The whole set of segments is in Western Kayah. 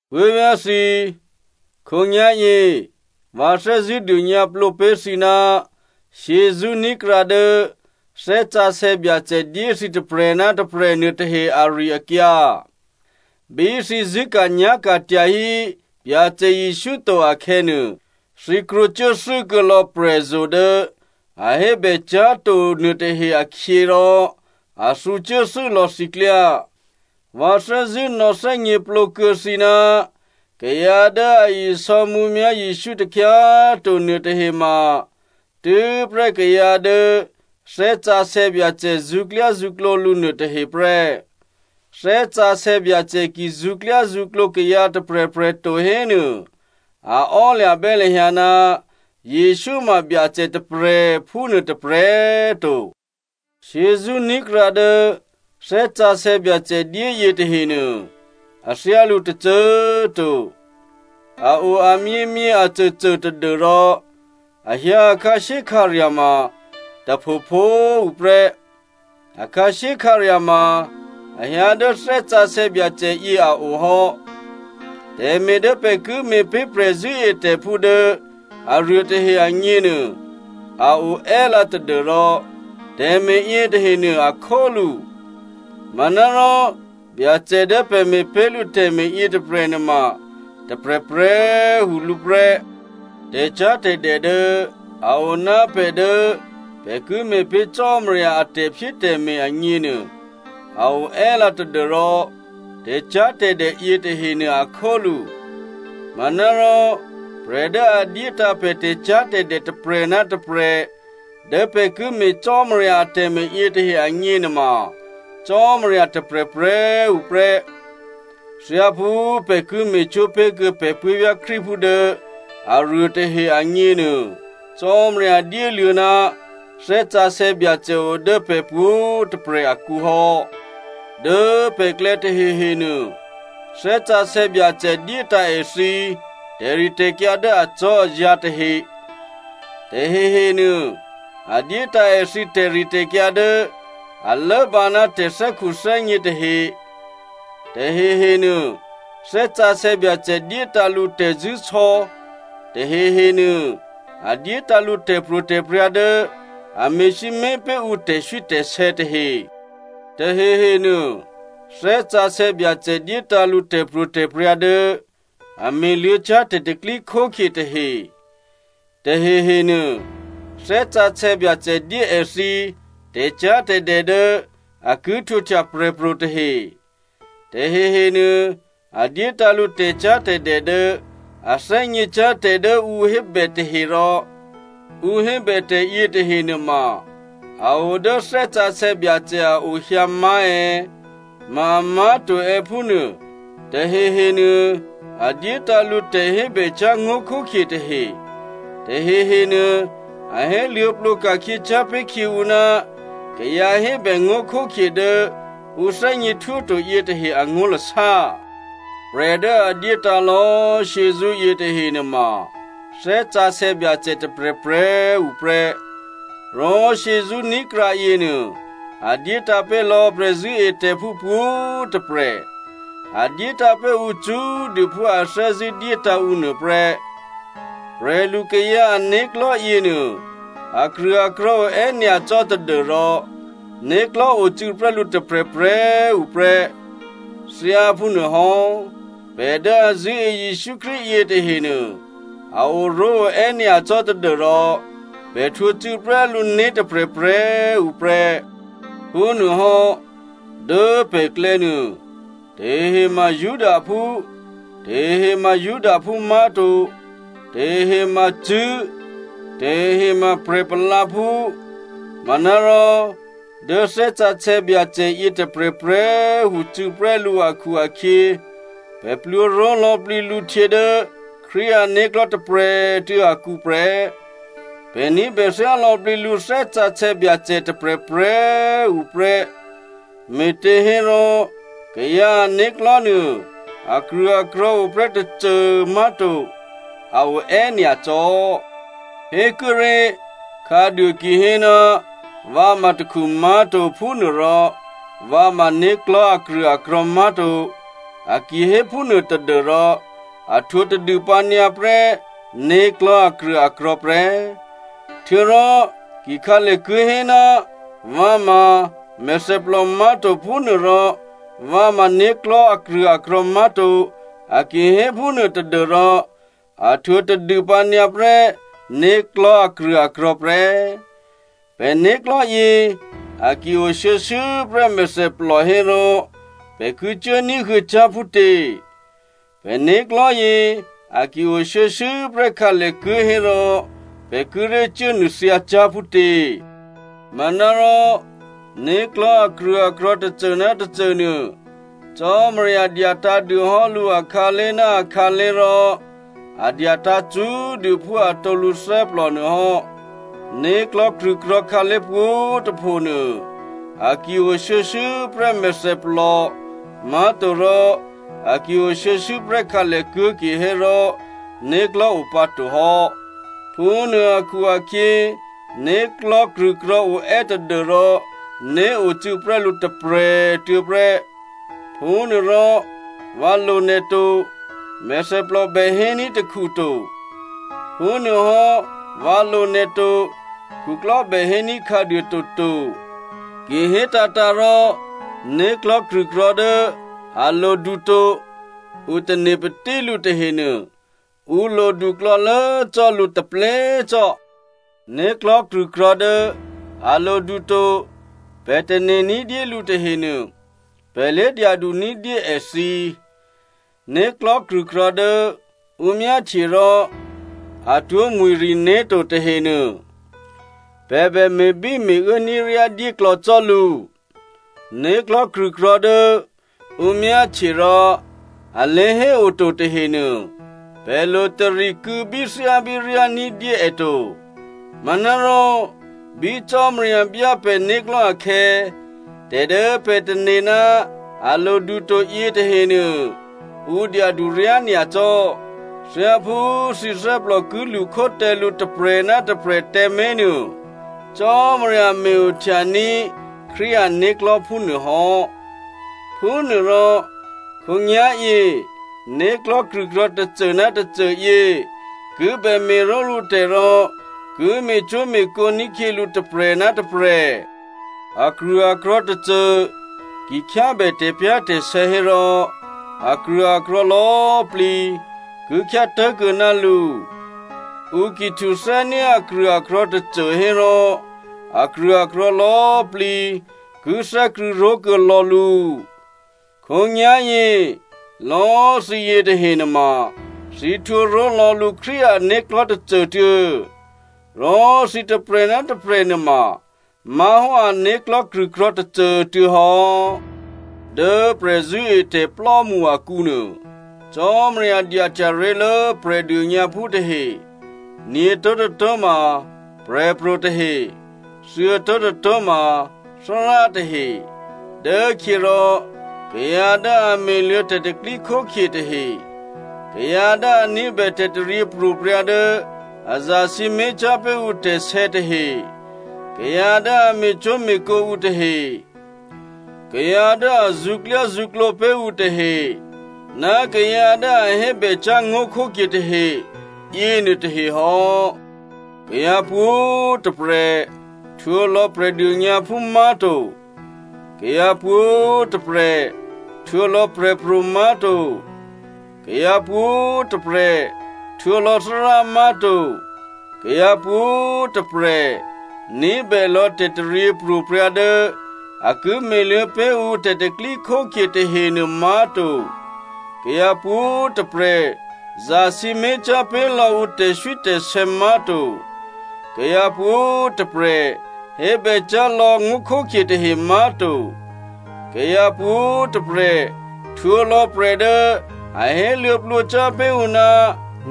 Puố̤vyá̤ thǐ꤮, khǒnyá̤yě, vǎ thè́zṳ̂́ dônyǎplǒ pé̤ thǐ ná shyězṳ́ ní̤krǎ dố Thè́ Sǎsè̌ Byacè dyé thǐ tôprè̤ ná tôprè̤ nuôtahe ari-akyǎ. Bí thǐ zṳ̂́ka̤nyá̤ka̤ tyahí Byacè Jesǔ to akhè̌nuô, thǐ krwǒcuốthû́ kuô̌ lò̌ prè̤zo̤ dố a hébècyá̤to nuôtahe akhyě, rò a thǔcuốthû́ lò̌ thǐ klyá. Vǎ thè́zṳ̂́ nò̌thè́gněplǒ kuô̌ thǐ ná kayǎ dố a isò̌ mǔmyá̤ Jesǔ takhyá꤮ to nuôtahe ma, tû́prè́ kayǎ dố Thè́ Sǎsè̌ Byacè zṳ̌klyázṳ̌klǒ lǔ nuôtahe prè́. Thè́ Sǎsè̌ Byacè ki zṳ̌klyázṳ̌klǒ kayǎ tôprè̤prè̤ to hénuô, a ò́lya̤bè́ lahyǎ ná Jesǔ ma Byacè tôprè̤, phúnuô tôprè̤꤮ to. Shyězṳ́ ní̤krǎ dố Thè́ Sǎsè̌ Byacè dyéyě tahenuô, a thyálǔ tôcô꤮ to, a o amyěmyě acôcô tadû́rò a hyǎ a khǎshyékhǎrya̤ ma tôphopho꤮ tuô̌ prè́. A khǎshyékhǎrya̤ ma a hyǎ dố Thè́ Sǎsè̌ Byacè yě a o hò́. Tè̤me̤ dố pè̤ ki me̤pé̤ prè̤zṳ̂́etè̤phú dố aruô tahe agněnuô a o è́lǎ tadû́rò tè̤me̤ yětahenuô a khólǔ. Manárò Byacè dố pè̤ me̤pé̤ lǔ tè̤me̤ yětôprè̤ nuôma tôprè̤prè̤꤮ tuô̌ lǔ prè́. Tè̤cyá̤tè̤dè dố a o ná pè̤ dố pè̤ ki me̤pé̤ Cò́marya a tè̤phyétè̤me̤ agněnuô, a o è́lǎ tadû́rò tè̤cyá̤tè̤dè yětahenuô a khólǔ. Manárò prè̤ dố a dyétǎ̤ pè̤ tè̤cyá̤tè̤dè tôprè̤ ná tôprè̤ dố pè̤ ki me̤ Cò́marya atè̤me̤ yětahe agně nuôma, Cò́marya tôprè̤prè̤꤮ tuô̌ prè́. Thyáphú pè̤ ki me̤cwó̤ pé̤ kuô̌ pè̤ puố̤vyá̤ Krístuphú dố aruô tahe agněnuô, Cò́marya dyéluô̌ ná Thè́ Sǎsè̌ Byacè o dố pè̤ pwǒ̤꤮ tôprè̤ akǔ hò́. Dố pè̤klè̌ tahehenuô, Thè́ Sǎsè̌ Byacè dyétǎ̤ èthǐ tè̤ritè̤kyǎ dố acò́azǎ̤ tahe, tahehenuô a dyétǎ̤ èthǐ tè̤ritè̤kyǎ dố a lốbǎ ná tè̤thè́khuthè́gně tahe. Tahehenuô Thè́ Sǎsè̌ Byacè dyétǎ̤ lǔ tè̤zṳ̂́sò̌, tahehenuô a dyétǎ̤ lǔ tè̤pro̤tè̤prya̤ dố a me̤sǐmé̤ pé̤ ǔ tè̤swítè̤sè̌ tahe. Tahehenuô Thè́ Sǎsè̌ Byacè dyétǎ̤ lǔ tè̤pro̤tè̤prya̤ dố a me̤luô̌cyá̤ tè̤pro̤tè̤prya̤ tahe. Tahehenuô Thè́ Sǎsè̌ Byacè dyé èthǐ tè̤cyá̤tè̤dè dố a ki htwǒhtya prè̤pro̤ tahe, tahehenuô a dyétǎ̤ lǔ tè̤cyá̤tè̤dè dố a thè́gněcyá̤ tè̤ dố ǔ hébè tahe rò ǔ hébè tè̤ yětahe nuôma a o dố Thè́ Sǎsè̌ Byacè a o hyǎ má̤ è̌, ma amá̤to è̌ phúnuô. Tahehenuô a dyétǎ̤ lǔ tè̤hébècyá̤ ngó̤khókhye tahe. Tahehenuô a héluô̌plǒ ka̤khyěcyá̤ pé̤ khyě ǔ ná kayǎhébè ngó̤khókhye dố ǔ thè́gněhtwó to yětahe angó̤lasá. Prè̤ dố a dyétǎ̤ lò̌꤮ shyězṳ́ yětahe nuôma Thè́ Sǎsè̌ Byacè tôprè̤prè̤꤮ tuô̌ prè́. Rò shyězṳ́ ní̤krǎ yěnuô, a dyétǎ̤ pé̤ lò̌ prè̤zṳ̂́etè̤phú pwǒ̤꤮ tôprè̤. A dyétǎ̤ pé̤ ǔ cṳ́꤮ dû phú a thè́zṳ̂́ dyétǎ̤ ǔ nuô prè́. Prè̤lukayǎ ané̤klò̤́ yěnuô akrṳ̂akrò̤̌ oè́ nyacò́ tadû́rò né̤klò̤́ ocû̌prè́ lǔ tôprè̤prè̤꤮ tuô̌ prè́. Thyáphúnuôhò́ pè̤ dố a zṳ̂́e Jesǔ Krístu yětahenuô, a oró̤ oè́ nyacò́ tadû́rò pè̤ htwǒ cû̌prè́ lǔ né̤ tôprè̤prè̤꤮ tuô̌ prè́. Phúnuôhò́, dố pè̤klè̌ nuô, tahehe ma Judaphú, tahehe ma Judaphú má̤to, tahehe ma cṳ̂́, tahehe ma prè̤ palǎphú. Manárò dố Thè́ Sǎsè̌ Byacè yětôprè̤prè̤꤮ tuô̌ cû̌prè́ lǔ akhu-akhyě, pè̤ plwǒ ró̤ lò̌plǐ lǔ htyě dố Krístu ané̤klò̤́ tôprè̤꤮ tuô̌ akǔ prè́. Pè̤ ní̤bè thyá lò̌plǐ lǔ Thè́ Sǎsè̌ Byacè tôprè̤prè̤꤮ tuô̌ prè́. Me̤těhérò, kayǎ ané̤klò̤́ nuô, akrṳ̂akrò̤̌ o prè́ tôcô má̤to. A o è́nyacò́. Hékuốré̤, khǎduô ki hé, “Vǎ ma takhu má̤to, phúnuôrò vǎ ma né̤klò̤́ akrṳ̂akrò̤̌ má̤to,” a ki hé phúnuô tadû́rò, a htwǒ tadûpǎ nyǎ prè́ né̤klò̤́ akrṳ̂akrò̤̌ prè́. Htuô̌rò ki khǎlèkuố̤ hé, “Vǎ ma mèthèplò má̤to, phúnuôrò vǎ ma né̤klò̤́ akrṳ̂akrò̤̌ má̤to,” a ki hé phúnuô tadû́rò a htwǒ tadûpǎ nyǎ prè́ né̤klò̤́ akrṳ̂akrò̤̌ prè́. Pè̤ né̤klò̤́yě a ki o shuô̌shuô̌ prè́ mèthèplò hérò, pè̤ ki cuố ní̤huô̌cyá̤ phútě? Pè̤ né̤klò̤́yě a ki o shuô̌shuô̌ prè́ khǎlèkuố̤ hérò, pè̤ kíré̤ cuốnuô̤thyǎcyá̤ phútě? Manárò né̤klò̤́ akrṳ̂akrò̤̌ tôcô ná tôcô nuô, Cò́marya dyatǎ̤dû hò́ lǔ akhǎlé̤ ná akhǎlé̤ rò a dyatǎ̤ cṳ́꤮ dû phú atǒ lǔthè́plò nuô hò́. Né̤klò̤́ krṳ̂krò̤̌ khǎlé̤ pwǒ̤꤮ tôpho nuô, a ki o shuô̌shuô̌ prè́ mèthèplò, má̤torò a ki o shuô̌shuô̌ prè́ khǎlèkuố̤ kihérò né̤klò̤́ o pǎ to hò́. Phúnuô akhu-akhyě, né̤klò̤́ krṳ̂krò̤̌ oè́ tadû́rò né̤ ocû̌ prè́ lǔ tôprè̤꤮ tuô̌ prè́. Phúnuôrò, “Vǎ lo nè̤ to,” mèthèplò bè héní̤ takhu to. Phúnuôhò́, “Vǎ lo nè̤ to,” khuklò́ bè héní̤ khǎduô toto. Ki hétǎ̤tǎ̤ rò, né̤klò̤́ krṳ̂krò̤̌ dố a lodu to, ǔ tane̤patí lǔ tahenuô, ǔ lodu klò̌lố cò́ lǔ taplé cò́. Né̤klò̤́ krṳ̂krò̤̌ dố a lodu to pè̤ tane̤ ní̤dyé lǔ tahenuô, pè̤ lé dyadu ní̤dyé èthǐ. Né̤klò̤́ krṳ̂krò̤̌ dố ǔ myáhtye rò atwó̤mwi̤riné̤ to tahenuô, pè̤ bè me̤bíme̤uố ní̤ryádyé klò̌ cò́ lǔ. Né̤klò̤́ krṳ̂krò̤̌ dố ǔ myáhtye rò a lé̤héoto tahenuô, pè̤ lo tari kû̌bíthyábíryá ní̤dyé è to. Manárò, bí Cò́marya byá pè̤né̤klò̤́ akhè̌, tè̤ dố pè̤ tane̤ ná a lodu to yětahenuô, è dyadu ryányacò́. Thyáphú thǐ thè́plò ki lṳkhó tǎ lǔ tôprè̤ ná tôprè̤꤮ tǎmé̤ nuô, Cò́marya me̤-ohtyaní̤ Krístu ané̤klò̤́ phúnuô hò́. Phúnuôrò, khǒnyá̤yě, né̤klò̤́ krṳ̂krò̤̌ tôcô ná tôcô yě ki bè me̤ró̤lǔ tè̤ rò ki me̤cwó̤me̤kǒ ní̤khyě lǔ tôprè̤ ná tôprè̤. Akrṳ̂akrò̤̌ tôcô ki khyábè tè̤pyá̤tè̤sè̌ hérò akrṳ̂akrò̤̌ lò̌꤮ plǐ ki khyá tố̤kuô̌ ná lǔ. Ǔ ki htuthè́ní̤ akrṳ̂akrò̤̌ tôcô hérò, akrṳ̂akrò̤̌ lò̌꤮ plǐ ki thè́krṳ̂̌ ró̤kuô̌ lò̌ lǔ. Khǒnyá̤yě, lò̌꤮ thǐ yětahe nuôma, thǐ htwǒ ró̤lò̌ lǔ Krístu ané̤klò̤́ tôcô꤮ tuô̌. Rò thǐ tôprè̤ ná tôprè̤ nuôma má̤hò́ ané̤klò̤́ krṳ̂krò̤̌ tôcô꤮ tuô̌ hò́. Dố prè̤zṳ̂́etè̤plò́mṳ akǔ nuô, Cò́marya dyahtya ré̤lố Prè̤dônyǎphú tahe, nyě̤tó̤tôtó̤ ma prè̤pro̤ tahe, thuô̌tó̤tôtó̤ ma Thárá tahe, dốkhyěrò kayǎ dố a me̤luô̌ tè̤pro̤tè̤prya̤ tahe, kayǎ dố a ní̤bè tè̤taryěpro̤prya̤ dố a zasǐmé̤cyá̤ pé̤ ǔ tè̤sè̌ tahe, kayǎ dố a me̤cwó̤me̤kǒ ǔ tahe, kayǎ dố a zṳ̌klyázṳ̌klǒ pé̤ ǔ tahe, ná kayǎ dố a hébècyá̤ ngó̤khókhye tahe yěnuô tahe hò́. Kayǎ pwǒ̤꤮ tôprè̤ htwǒ lò̌ Prè̤dônyǎphú má̤to. Kayǎ pwǒ̤꤮ tôprè̤ htwǒ lò̌ prè̤pro̤ má̤to. Kayǎ pwǒ̤꤮ tôprè̤ htwǒ lò̌ Thárá má̤to. Kayǎ pwǒ̤꤮ tôprè̤ ní̤bè lò̌ tè̤taryěpro̤prya̤ dố a ki me̤luô̌ pé̤ ǔ tè̤pro̤tè̤prya̤ tahenuô má̤to. Kayǎ pwǒ̤꤮ tôprè̤ zasǐmé̤cyá̤ pé̤ lò̌ ǔ tè̤swítè̤sè̌ má̤to, kayǎ pwǒ̤꤮ tôprè̤ hébècyá̤ lò̌ ngó̤khókhye tahe má̤to, kayǎ pwǒ̤꤮ tôprè̤ htwǒlò̌ prè̤ dố a héluô̌plǒcyá̤ pé̤ ǔ ná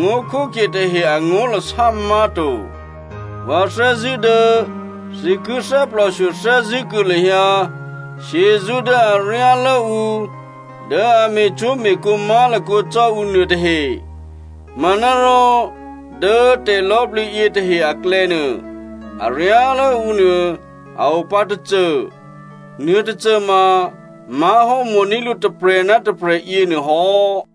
ngó̤khókhye tahe angó̤lasá má̤to. Vǎ thè́zṳ̂́ dố thǐ ki thè́plòshyo thè́zṳ̂́ kuô̌ lahyǎ shyězṳ́ dố aryálố ǔ dố a me̤cwó̤me̤kǒ má̤lakǒ cò́ ǔ nuô tahe. Manárò dố tè̤lò̌plǐ yětahe aklè̌nuô, aryálố ǔ nuô a o pǎ tôcô. Nuôtôcôma má̤hò́ mo̤ní̤ lǔ tôprè̤ ná tôprè̤ yěnuô hò́.